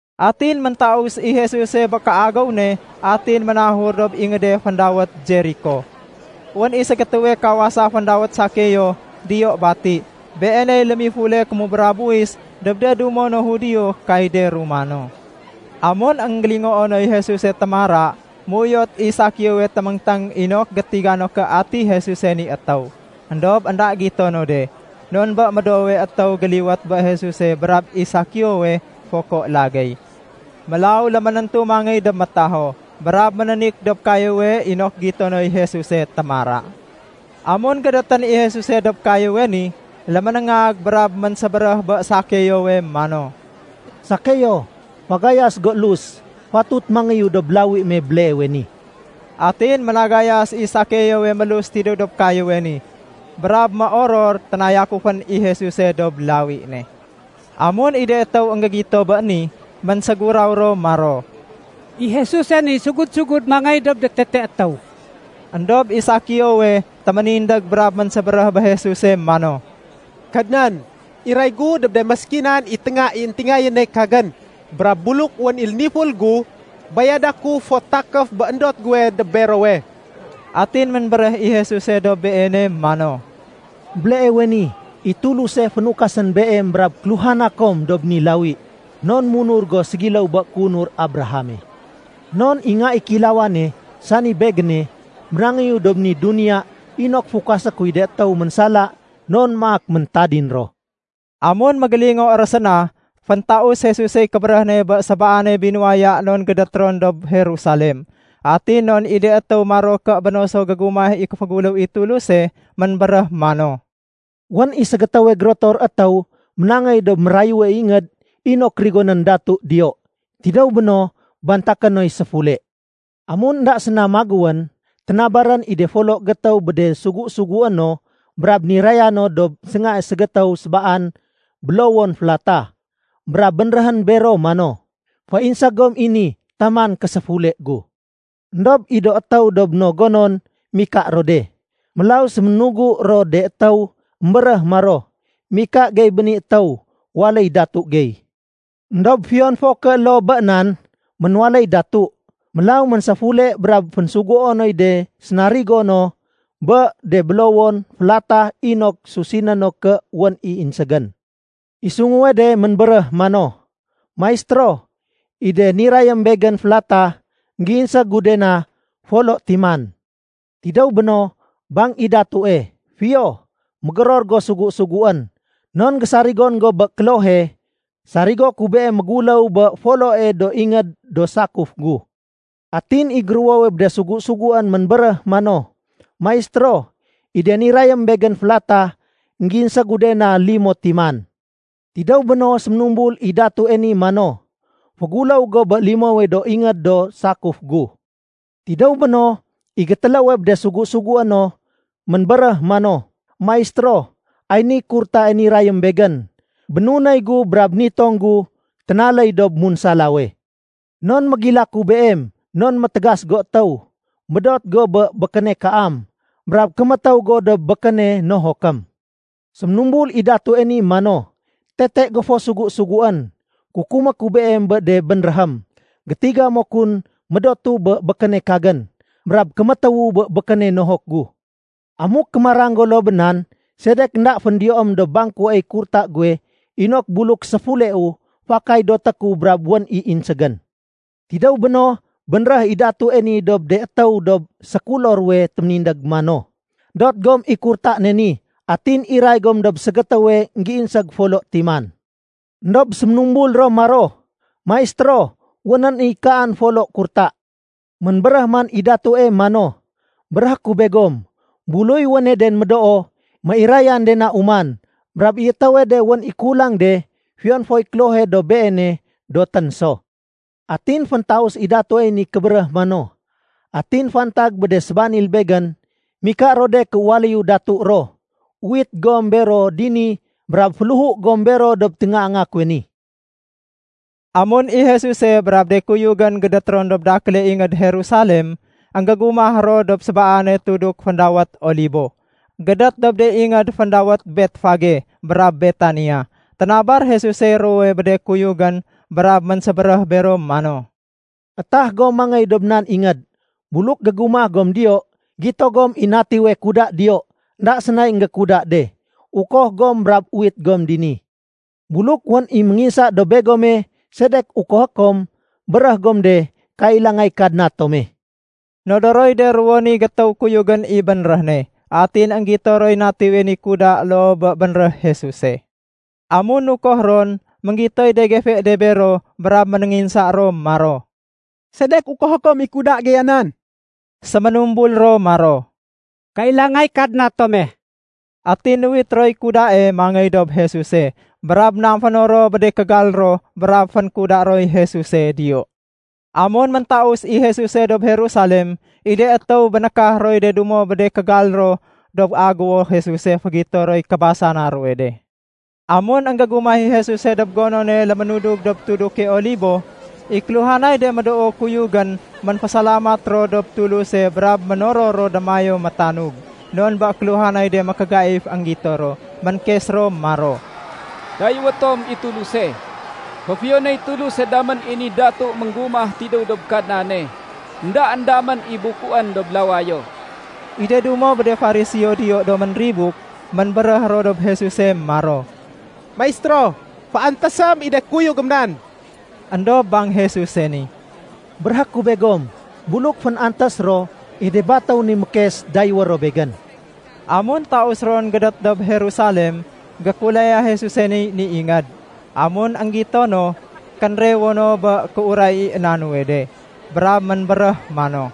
Atin méntaus i Jesuse bé kéagéw ne, atin ménahur dob ingéde féndawét Jeriko. Wén i ségétéwe kawasa féndawét Sakeo diyo bati. Beeney lémifule kémubra buwis dob de dumo no Judio kay de Romano. Amun énggélingoo noy Jesuse témara, méuyot i Sakeowe téméngténg inok gétiga no ké ati Jesuse ni étéw. Endob énda gito no de, non bé médoowe étéw géliwét bé Jesuse brab i Sakeowe foko lagéy. Mélaw léménéntu mangéy dob métaho, brab ménénik dob kayéwe inok gito noy Jesuse témara. Amun gédétén i Jesuse dob kayéwe ni, léménéngag brab ménsébéréh bé Sakeowe mano, “Sakeo, fagayas go élus. Fatut mangéyu dob lawi me béleewe ni.” Atin ménagayas i Sakeowe mélus tidéw dob kayéwe ni brab méoror ténayakufén i Jesuse dob lawi ne. Amun i de étéw énggégito bé ni, ménséguraw ro maro, “I Jesuse ni sugud-sugud mangéy dob tetee étéw.” Endob i Sakeowe téménindég brab ménsébéréh bé Jesuse mano, “Kadnan, iray gu dob de méskinan i ténga i éntingayéne kagén. Brab buluk wén i léniful gu, bayada ku fot takéf bé éndot guwe dob berowe.” Atin ménbéréh i Jesuse dob beene mano, “Béleewe ni, i Tuluse fénukasén beem brab kéluhana kom dob ni lawi, non munur go ségiléw bé kéunur Abrahame. Non i Nga i Kéilawane, sani Begéne, ménangéyu dob ni duniya inok fukasé kuy de étéw ménsala non maak méntadin ro.” Amun mégélingo ro séna, féntaus Jesusey kébéréh ne bé sébaane binuwaya non gédét ron dob Jerusalem, atin non i de étéw maro ké béno so gégumah i kéféguléw i Tuluse. Ménbéréh mano, “Wén i ségétéwe gérotor étéw ménangéy dob mérayue ingéd inok rigonén datu diyo. Tidéw béno, bantaké noy séfule. Amun énda séna magéwén, ténabarén i foloe gétéw bé de sugu-sugué no brab niraya no dob séngae ségétéw sébaan bélowon félatah. Brab bénréhén bero mano, ‘Féinség gom i ni taman késéfule gu.’ Endob i do étéw dob no gonon mika ro de. Mélaw séménugu ro de étéw émbéréh maro, ‘Mika gey bé ni étéw waléy datu gey.’ “Endob fiyon fo ké loo bé nan, ménwaléy datu. Mélaw ménséfule brab fénsuguo noy de sénarigo no bé de bélowon félatah inok susiné no ké wén i inségén. I sunguwe de ménbéréh mano, ‘Maistéro, i de nirayém begén félatah, énggéinség gu de na folo timan.’ Tidéw béno, bang i datue, ‘Fiyo, mégéror go sugu-suguén. Non gésarigon go bé klohe, sarigo ku beem méguléw bé foloe do ingéd do sakuf gu.’ Atin i géruwowe bé de sugu-suguén ménbéréh mano, ‘Maistéro, i de nirayém begén félatah, énggéinség gu de na limo timan.’ Tidéw béno, séménumbul i datue ni mano, ‘Féguléw go bé limowe do ingéd do sakuf gu.’ Tidéw béno, i gétéléwe bé de sugu-sugué no ménbéréh mano, ‘Maistéro, ay niy kurtae nirayém begén. Bénunéy gu brab nitong gu ténaléy dob munsalawe. Non mégilaku beem non métégas go étéw. Médot go bé békéne kaam. Brab kémétéw go dob békéne nohokém.’ Séménumbul i datue ni mano, ‘Tete go fo sugu-suguén. Kukumé ku beem bé de bénréhém. Gétiga mo kun médotu bé békéne kagén, brab kémétéwu bé békéne nohok gu. Amuk kémarang go loo bé nan, sedek énda féndiyoém dob bangkuey kurta guwe inok buluk séfuleu, fakay doté ku brab wén i inségén?’ Tidéw béno, bénréh i datue ni dob de étéw dob sékulo ruwe téménindég mano, ‘Dot gom i kurta ne ni atin iray gom dob ségétéwe énggéinség folo timan.’ Endob séménumbul ro maro, ‘Maistéro, wénén i kaan folo kurta.’ Ménbéréh man i datue mano, ‘Béréhé ku begom, buluy wéne den médoo, méirayén de na uman. Brab i étéwe de wén i kulang de, fiyon foy klohe dob beene dotén so.’ Atin féntaus i datuey ni kébéréh mano, ‘Atin fantag bé de sébanil begén, mika ro de ké waléyu datu ro, uwit gom bero dini brab féléhu gom bero dob téngaanga kuwe ni.’” Amun i Jesuse brab de kuyugén gédét ron dob dakéle ingéd Jerusalem, énggégumah ro dob sébaane tuduk féndawét Olibo, gédét dob de ingéd féndawét Betfage brab Betania. Ténabar Jesusey ruwowe bé de kuyugén, brab ménsébéréh bero mano, “Etah gom mangéy dob nan ingéd. Buluk gégumah gom diyo, gito gom i natiwe kuda diyo, énda sénay énggékuda de. Ukoh gom brab uwit gom dini. Buluk wén i ménginsa dob begome, ‘Sedek ukohé kom?’ béréh gom de, ‘Kailangay Kadna tome.’” Nodoroy de ruwo ni gétéw kuyugén i bénréh ne. Atin énggito roy natiwe ni kuda loo bé bénréh Jesuse. Amun nukoh ron, énggitoy de gefe de bero brab ménénginsa ro maro, “Sedek ukohé kom i kuda geya nan?” Séménumbul ro maro, “Kailangay Kadna tome.” Atin nuwit roy kudae mangéy dob Jesuse. Brab namféno ro bé de kégal ro brab fénkuda roy Jesuse diyo. Amun méntaus i Jesuse dob Jerusalem, i de étéw bénékah roy de dumo bé de kégal ro dob aguwo Jesuse fégito roy kébasana ruwe de. Amun énggégumah i Jesuse dob gonone lémudug dob tuduke Olibo, i kéluhanay de médoo kuyugén ménfésalamat ro dob Tuluse brab ménoror ro démayéw métanug, non bé kéluhanay de mékégaif énggito ro. Ménkes ro maro, “Dayéwé tom i Tuluse. Féfiyonéy Tuluse damén i ni datu ménggumah tidéw dob Kadnane. Endaén damén i bukuén dob lawayo.” I de dumo bé de Fariseo diyo do ménribuk, ménbéréh ro dob Jesuse maro, “Maistéro, féantésém i de kuyugém nan.” Endob bang Jesuse ni, “Béréhé ku begom, buluk fén-antés ro, i de batéw ni mékes dayéwé ro Begén.” Amun taus ron gédét dob Jerusalem, gékulaya Jesusey ni ingéd. Amun énggito no, kénrewo no bé kéuray i na nuwe de. Brab ménbéréh mano,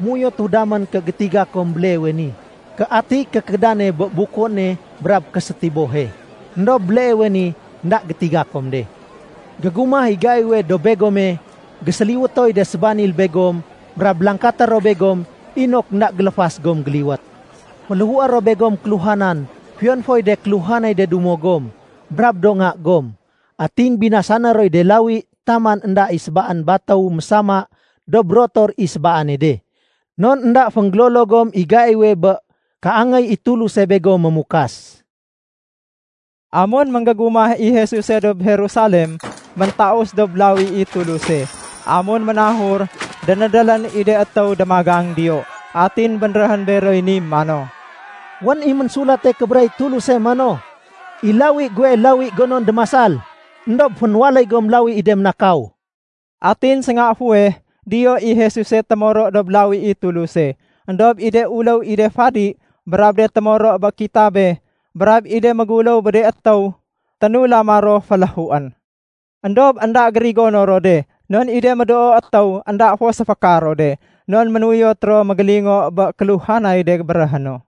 “Méuyotu damén gétiga kom béleewe ni ké atiy kékédane bé bukuéne brab késétibohe, éndob béleewe ni énda gétiga kom de. Gégumah i gaiwe dob begome, géséliwétoy de sébanil begom brab langkaté ro begom inok énda géléfas gom géliwét. Féléhué ro begom kéluhanan fiyon foy de kéluhanay de dumo gom, brab do nga gom. Atin binasané roy de lawi taman énda i sébaan batéw mésama dob rotor i sébaane de. Non énda fénggélolo gom i gaiwe bé kéangéy i Tuluse begom mémukas.” Amun énggégumah i Jesuse dob Jerusalem, méntaus dob lawi i Tuluse. Amun ménahur, dénédélén i de étéw démagang diyo. Atin bénréhén beroy ni mano, “Wén i Ménsulate Kébéréh i Tuluse mano, ‘I lawi guwe, lawi gonon démasal.’ Endob fénwaléy gom lawi i de ménakaw.” Atin sénga fuweh diyo i Jesuse témoro dob Lawi i Tuluse. Endob i de uléw i de fadi, brab de témoro bé kitabe, brab i de méguléw bé de étéw, ténulama ro féléhuén. Endob énda gérigono ro de non i de médoo étéw énda fo séféka ro de, non ménuyot ro mégélingo bé kéluhanay de béréhé no.